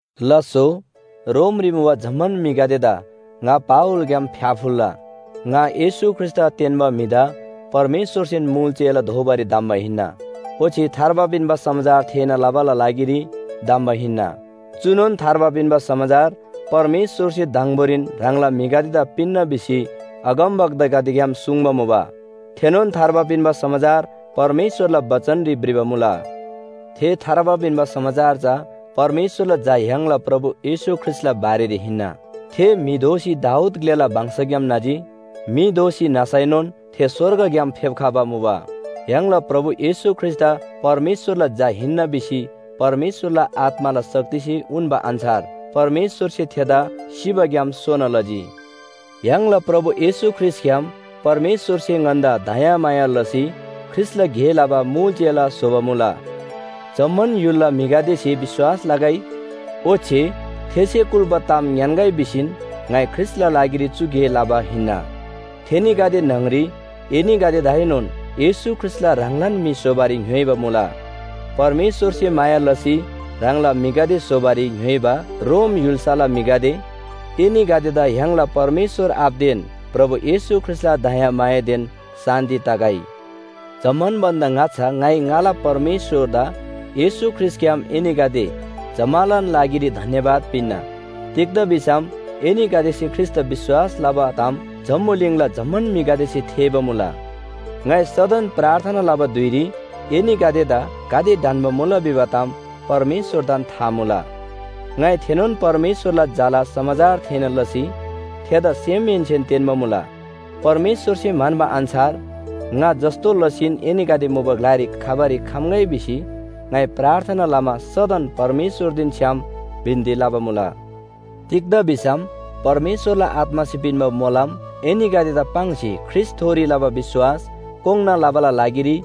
लास्‍सो, रोमरी मुबा जम्‍मान म्‍हिगदेदा ङा पावलग्‍याम फ्‍याफुल्‍ला। ङा येशू ख्रीष्‍टदा तेन्‍बा म्‍हिदा परमेश्‍वरसेन मुल चेला दोबारी धम्‍बा हिन्‍ना। ओच्‍छे थार्बा पिन्‍बा समाचार थेःना लबाला लागिरी धम्‍बा हिन्‍ना। चुनोन थार्बा पिन्‍बा समाचार परमेश्‍वरसे दङबोरीन ह्राङला म्‍हिगदेदा पिन्‍ना भिसी अगमवक्तागदेग्‍याम सुङ्बा मुबा। थेनोन थार्बा पिन्‍बा समाचार परमेश्‍वरला बचनरी भ्रिबा मुला। थे थार्बा पिन्‍बा समाचार चा परमेश्‍वरला झा य्‍हाङला प्रभु येशू ख्रीष्‍टला बारेरी हिन्‍ना। थे म्‍हि दोसी दाऊद ग्‍लेला वंशग्‍याम न्‍हजी। म्‍हि दोसी न्‍हसैनोन थे स्‍वर्गग्‍याम फेप्‍खबा मुबा, य्‍हाङला प्रभु येशू ख्रीष्‍टदा परमेश्‍वरला झा हिन्‍ना भिसी परमेश्‍वरला आत्‍माला शक्तिसे उन्‍बा अन्‍छार परमेश्‍वरसे थेदा सिबाग्‍याम सोना लजी। य्‍हाङला प्रभु येशू ख्रीष्‍टग्‍याम परमेश्‍वरसे ङन्‍दा दयामाया लसी ख्रीष्‍टला गे लबा मुल चेला स्‍होबा मुला। जम्‍मान य्‍हुलला म्‍हिगदेसे विश्‍वास लगै ओच्‍छे थेसे कुल्‍बा ताम ङ्‌यान्‍गै भिसीन ङाइ ख्रीष्‍टला लागिरी चु गे लबा हिन्‍ना। थेनीगदे न्‍हङरी एनीगदेदाएनोन येशू ख्रीष्‍टला ह्राङलान म्‍हि स्‍होबारी ङ्‌योइबा मुला। परमेश्‍वरसे माया लसी ह्राङला म्‍हिगदे स्‍होबारी ङ्‌योइबा रोम य्‍हुल्‍साला म्‍हिगदे, एनीगदेदा य्‍हाङला परमेश्‍वर आबादेन प्रभु येशू ख्रीष्‍टला दयामायादेन शान्‍ति तगै। जम्‍मान भन्‍दा ङाच्‍छा ङाइ ङाला परमेश्‍वरदा येशू ख्रीष्‍टग्‍याम एनीगदे जम्‍मालान लागिरी धन्‍यवाद पिन्‍ना। तिग्‍दा भिसम एनीगदेसे ख्रीष्‍टदा विश्‍वास लबा ताम जम्‍बुलिङला जम्‍मान म्‍हिगदेसे थेःबा मुला। ङाइ सदन प्रार्थना लबा धुइरी एनीगदेदा गाते ढन्‍बा मुला भिबा ताम परमेश्‍वरदान था मुला। ङाइ थेनोन परमेश्‍वरला झाला समाचार थेःना लसी थेदा सेमहेन्‍सेन तेन्‍बा मुला। परमेश्‍वरसे म्‍हन्‍बा अन्‍छार ङा जस्‍तो लसीन एनीगदे मुबा ग्‍लारी खबारी खम्‍गै भिसी ङाइ प्रार्थना लमा सदन परमेश्‍वरदेन छ्‌याम बिन्‍ती लबा मुला। तिग्‍दा भिसम परमेश्‍वरला आत्‍मासे पिन्‍बा मोलम एनीगदेदा पाङ्सी ख्रीष्‍टथोरी लबा विश्‍वास कोङ्‌ना लबाला लागिरी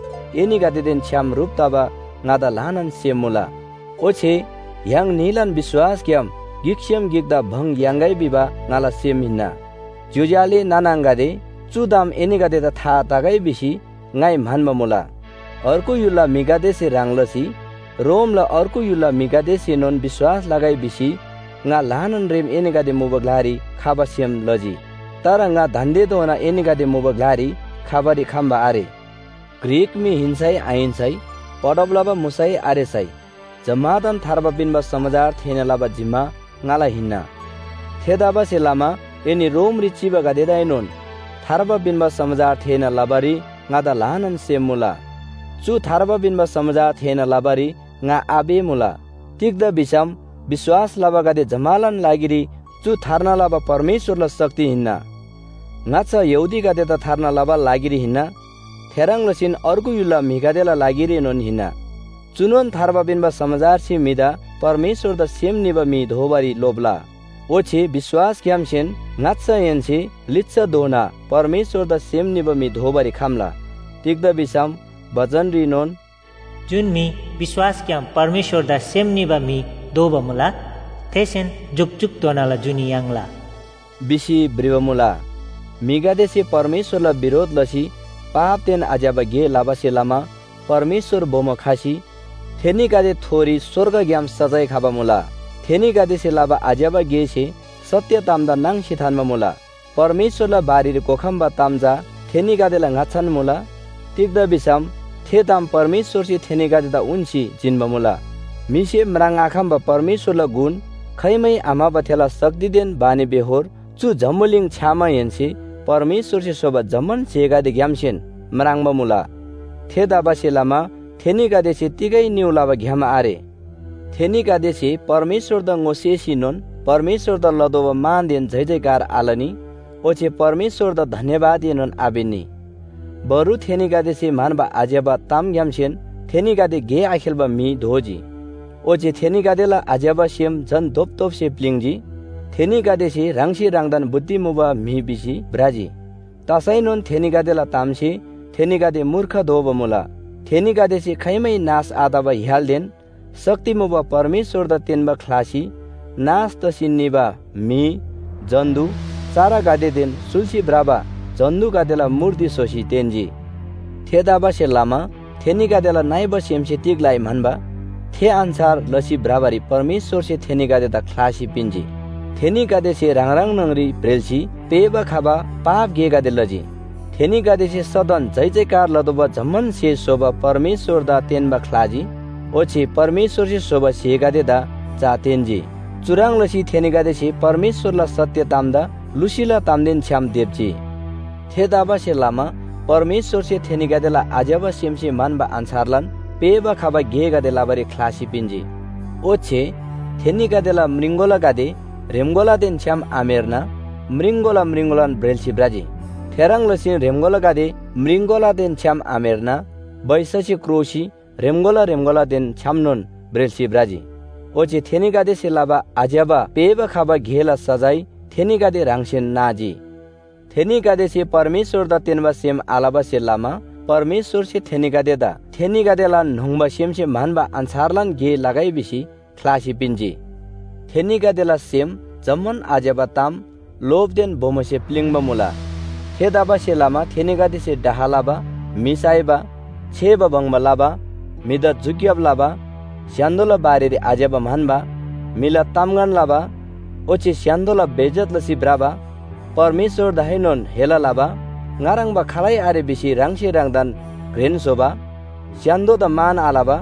एनीगदेदेन छ्‌याम ह्रुप तबा ङादा ल्‍हानान सेम मुला। ओच्‍छे य्‍हाङ न्‍हीलान विश्‍वासग्‍याम गिकसेम गिकदा भङ याङ्‌गै भिबा ङाला सेम हिन्‍ना। ज्‍योज्‍यो आले नाना आङागदे, चु ताम एनीगदेदा था तगै भिसी ङाइ म्‍हन्‍बा मुला। अर्गु ग्‍लाला म्‍हिगदेसे ह्रङ् लसी रोमला अर्गु य्‍हुलला म्‍हिगदेसेनोन विश्‍वास लगै भिसी ङा ल्‍हानान रेम एनीगदे मुबा ग्‍लारी खबा सेम लजी। तर ङा दान्‍देधोना एनीगदे मुबा ग्‍लारी खबारी खम्‍बा आरे। ग्रीक म्‍हि हिन्‍सै आहिन्‍सै, पढब लबा मुसै आरेसै जम्‍मादान थार्बा पिन्‍बा समाचार थेःना लबा जिम्‍मा ङाला हिन्‍ना। थेतबासेलमा एनी रोमरी चिबागदेदाएनोन थार्बा पिन्‍बा समाचार थेःना लबारी ङादा ल्‍हानान सेम मुला। चु थार्बा पिन्‍बा समाचार थेःना लबारी ङा आपेःमुला। तिग्‍दा भिसम विश्‍वास लबागदे जम्‍मालान लागिरी चु थार्ना लबा परमेश्‍वरला शक्ति हिन्‍ना। ङाच्‍छा यहूदीगदेदा थार्ना लबाला लागिरी हिन्‍ना, थेह्रङ् लसीन अर्गु य्‍हुलला म्‍हिगदेला लागिरीनोन हिन्‍ना। चुनोन थार्बा पिन्‍बा समाचारसे म्‍हिदा परमेश्‍वरदा सेम निबा म्‍हि दोबारी लोप्‍ला, ओच्‍छे विश्‍वासग्‍यामसेन ङाच्‍छाहेन्‍से लिच्‍छाधोना परमेश्‍वरदा सेम निबा म्‍हि दोबारी खम्‍ला। तिग्‍दा भिसम बचनरीनोन “जुन म्‍हि विश्‍वासग्‍याम परमेश्‍वरदा सेम निबा म्‍हि दोबा मुला, थेसेन जुकजुकधोनाला जुनी याङ्ला” भिसी भ्रिबा मुला। म्‍हिगदेसे परमेश्‍वरला बिरोध लसी पापदेन आज्‍यबा गे लबासे लमा परमेश्‍वर बोमो खसी थेनीगदेथोरी स्‍वर्गग्‍याम सजाय खबा मुला। थेनीगदेसे लबा आज्‍यबा गेसे सत्‍य तामदा नाङ्सी थान्‍बा मुला। परमेश्‍वरला बारेरी घोखम्‍बा ताम चा थेनीगदेला ङाच्‍छान मुला। तिग्‍दा भिसम थे ताम परमेश्‍वरसे थेनीगदेदा उन्‍सी जिन्‍बा मुला। म्‍हिसे म्राङ्आखम्‍बा परमेश्‍वरला गुण, खाइमै आम्‍हबा थेला शक्तिदेन बानीबेहोर चु जम्‍बुलिङ छ्‌यामाहेन्‍से परमेश्‍वरसे स्‍होबा जम्‍मान स्‍हेगदेग्‍यामसेन म्राङ्बा मुला। थेतबासेलमा थेनीगदेसे तिगै निउ लबा ग्‍याम आरे। थेनीगदेसे परमेश्‍वरदा ङोसेसीनोन परमेश्‍वरदा लतोःबा मानदेन जयजयकार आलनी ओच्‍छे परमेश्‍वरदा धन्‍यवादएनोन आपिन्‍नी। बरु थेनीगदेसे म्‍हन्‍बा आज्‍यबा तामग्‍यामसेन थेनीगदे गे आखेल्‍बा म्‍हि दोजी। ओच्‍छे थेनीगदेला आज्‍यबा सेम झन धोपधोपसे प्‍लिङ्जी। थेनीगदेसे ह्राङसे ह्राङदान बुद्धि मुबा म्‍हि भिसी भ्रजी, तसैनोन थेनीगदेलान तामसे थेनीगदे मूर्ख दोबा मुला। थेनीगदेसे खाइमै नाश आतबा य्‍हालदेन शक्ति मुबा परमेश्‍वरदा तेन्‍बा ख्‍लासी नाश तसी निबा म्‍हि, जन्‍तु, चरागदेदेन सुल्‍सी भ्रबा जन्‍तुगदेला मूर्ति स्‍होसी तेन्‍जी। थेतबासेलमा थेनीगदेला नइबा सेमसे तिग लइ म्‍हन्‍बा, थे अन्‍छार लसी भ्रबारी परमेश्‍वरसे थेनीगदेदा ख्‍लासी पिन्‍जी। थेनीगदेसे ह्राङ ह्राङ न्‍हङरी ब्रेल्‍सी पेःबा खबा पाप गेगदे लजी। थेनीगदेसे सदन जयजयकार लतोःबा जम्‍मान स्‍हे स्‍होबा परमेश्‍वरदा तेन्‍बा ख्‍लाजी। ओच्‍छे परमेश्‍वरसे स्‍होबा स्‍हेगदेदा चा तेन्‍जी। चुह्रङ् लसी थेनीगदेसे परमेश्‍वरला सत्‍य तामदा लुसीला तामदेन छ्‌याम देप्‍जी। थेतबासेलमा परमेश्‍वरसे थेनीगदेला आज्‍यबा सेमसे म्‍हन्‍बा अन्‍छारलान पेःबा खबा गेगदे लबारी ख्‍लासी पिन्‍जी। ओच्‍छे थेनीगदेला म्रिङकोलागदे ह्रेम्‍कोलादेन छ्‌याम आम्‍हेर्ना म्रिङकोला म्रिङकोलान ब्रेल्‍सी भ्रजी। थेह्रङ् लसीन ह्रेम्‍कोलागदे म्रिङकोलादेन छ्‌याम आम्‍हेर्ना बैससे क्रोसी ह्रेम्‍कोला ह्रेम्‍कोलादेन छ्‌यामनोन ब्रेल्‍सी भ्रजी। ओच्‍छे थेनीगदेसे लबा आज्‍यबा पेःबा खबा गेला सजाय थेनीगदे ह्राङसेन नाजी। थेनीगदेसे परमेश्‍वरदा तेन्‍बा सेम आलबासे लमा परमेश्‍वरसे थेनीगदेदा थेनीगदेलान न्‍होङ्बा सेमसे म्‍हन्‍बा अन्‍छारलान गे लगै भिसी ख्‍लासी पिन्‍जी। थेनीगदेला सेम जम्‍मान आज्‍यबा ताम, लोभदेन बोमोसे प्‍लिङ्बा मुला। थेतबासेलमा थेनीगदेसे डाह लबा, म्‍हि साइबा, छेबा बङ्बा लबा, म्‍हिदा झुक्‍याब लबा, स्‍य्‍हान्‍दोला बारेरी आज्‍यबा म्‍हन्‍बा, म्‍हिला तामगन लबा, ओच्‍छे स्‍य्‍हान्‍दोला बेइज्‍जत लसी भ्रबा, परमेश्‍वरदाएनोन हेला लबा, ङा ह्रङ्‌बा खालै आरे भिसी ह्राङसे ह्राङदान घ्रेन स्‍होबा, स्‍य्‍हान्‍दोदा मान आलबा,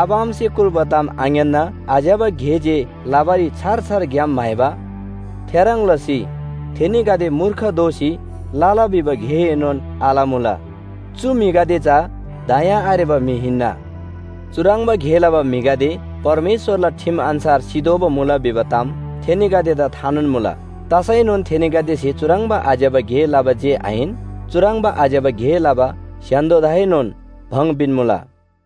आबा आमासे कुल्‍बा ताम आङ्‌यान्‍ना आज्‍यबा गे जे लबारी छार छार ग्‍याम म्‍हाइबा, थेह्रङ् लसी थेनीगदे मूर्ख दोसी लला भिबा गेएनोन आलमुला। चु म्‍हिगदे चा दया आरेबा म्‍हि हिन्‍ना। चुह्रङ्बा गे लबा म्‍हिगदे परमेश्‍वरला ठिम अन्‍छार सितोःबा मुला भिबा ताम थेनीगदेदा थानोन मुला, तसैनोन थेनीगदेसे चुह्रङ्बा आज्‍यबा गे लबा जे आहिन, चुह्रङ्बा आज्‍यबा गे लबा स्‍य्‍हान्‍दोदाएनोन भङ पिन्‍मुला।